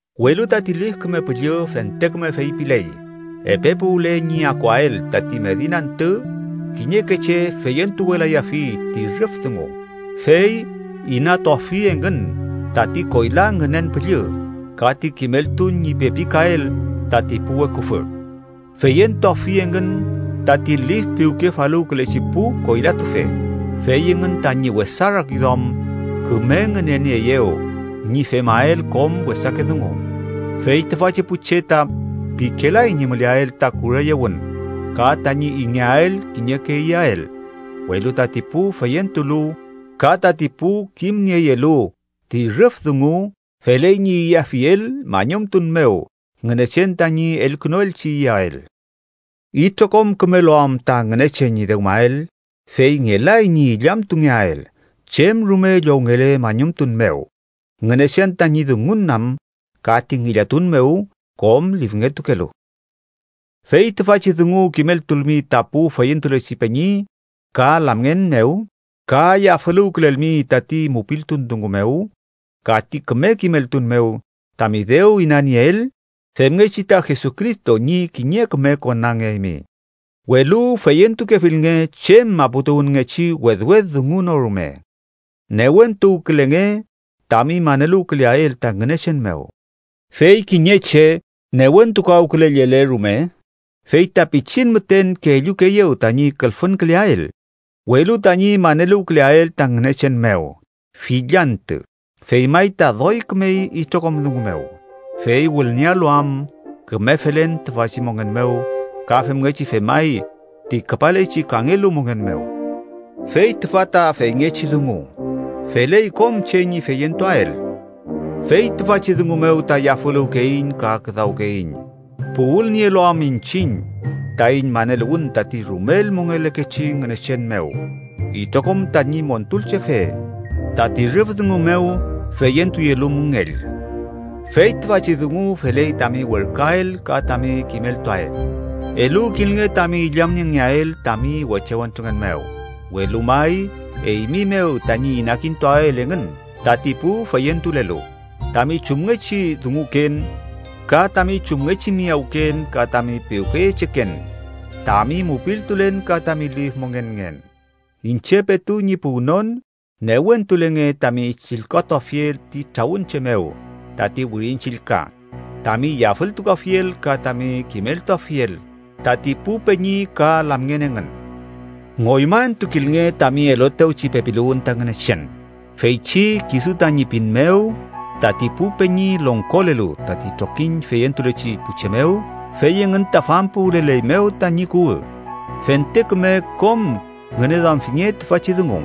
Welu tati Lif Küme Püllü fente küme feypiley epe puwle ñi akuael tati medin antü kiñeke che feyentuwelayafi ti rüf dungu, fey inatuafi engün tati koyla ngünen püllü, ka ti kimeltun ñi pepikael tati pu weküfü. Feyentuafi engün tati lif piwkefaluwkülechi pu koylatufe, fey engün tañi wesa rakiduam küme ngünenieeyew ñi femael kom wesake dungu. Fey tüfachi pu che ta pikelay ñi müleael ta kureyewün ka tañi ingeael kiñeke iyael. Welu tati pu feyentulu ka tati pu kimnieyelu ti rüf dungu feley ñi iyafiel mañumtun mew Ngünechen tañi elkünuelchi iyael. Itrokom kümelu am ta Ngünechen ñi dewmael, fey ngelay ñi illamtungeael chem rume llowngele mañumtun mew, Ngünechen tañi dungun am ka ti ngillatun mew kom lifngetukelu. Fey tüfachi dungu kimeltulmi ta pu feyentulechi peñi ka lamngen mew ka yafüluwkülelmi tati mupiltun dungu mew ka ti küme kimeltun mew tami dew inanieel, femngechi ta Jesucristo ñi kiñe küme konangeaymi. Welu feyentukefilnge chem maputuwünngechi wedwed dungu no rume. Newentuwkülenge tami maneluwküleael ta Ngünechen mew. Fey kiñe che newentukawkülellele rume fey ta pichin müten kellukeeyew tañi külfünküleael, welu tañi maneluwküleael ta Ngünechen mew fill antü fey may ta doy kümey itrokom dungu mew, fey wülniealu am küme felen tüfachi mongen mew ka femngechi femay ti küpalechi kangelu mongen mew. Fey tüfa ta feyngechi dungu, feley kom che ñi feyentuael. Fey tüfachi dungu mew ta yafüluwkeiñ ka küdawkeiñ, puwülnielu am iñchiñ taiñ maneluwün tati rumel mongelekechi Ngünechen mew, itrokom tañi Montulchefe, tati rüf dungu mew feyentuyelu müngell. Fey tüfachi dungu feley tami werküael ka tami kimeltuael. Eluwkilnge tami illamniengeael tami weche wentrungen mew, welu may eymi mew tañi inakintuael engün tati pu feyentulelu, tami chumngechi dunguken ka tami chumngechi miyawken ka tami piwkeyecheken, tami mupiltulen ka tami lif mongenngen. Iñche petu ñi puwnon, newentulenge tami chillkatuafiel ti trawün che mew tati Wirin Chillka, tami yafültukuafiel ka tami kimeltuafiel tati pu peñi ka lamngen engün. Ngoymaentukilnge tami eluetewchi pepiluwün ta Ngünechen feychi, kisu tañi pin mew, tati pu peñi longkolelu tati trokiñ feyentulechi pu che mew fey engün ta fampuwüleleymew tañi kuwü. Fente küme kom ngüneduamfinge tüfachi dungu,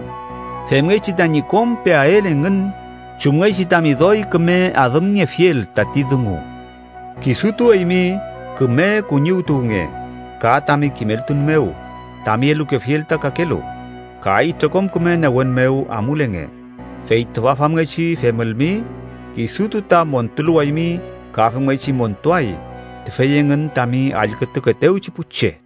femngechi tañi kom peael engün chumngechi tami doy küme adümniefiel tati dungu. Kisutu eymi küme kuñiwtuwnge ka tami kimeltun mew tami elukefiel ta kakelu, ka itrokom küme newen mew amulenge. Fey tüfa famngechi femülmi, kisutu ta montuluwaymi ka femngechi montuay tüfey engün tami allkütukeetewchi pu che.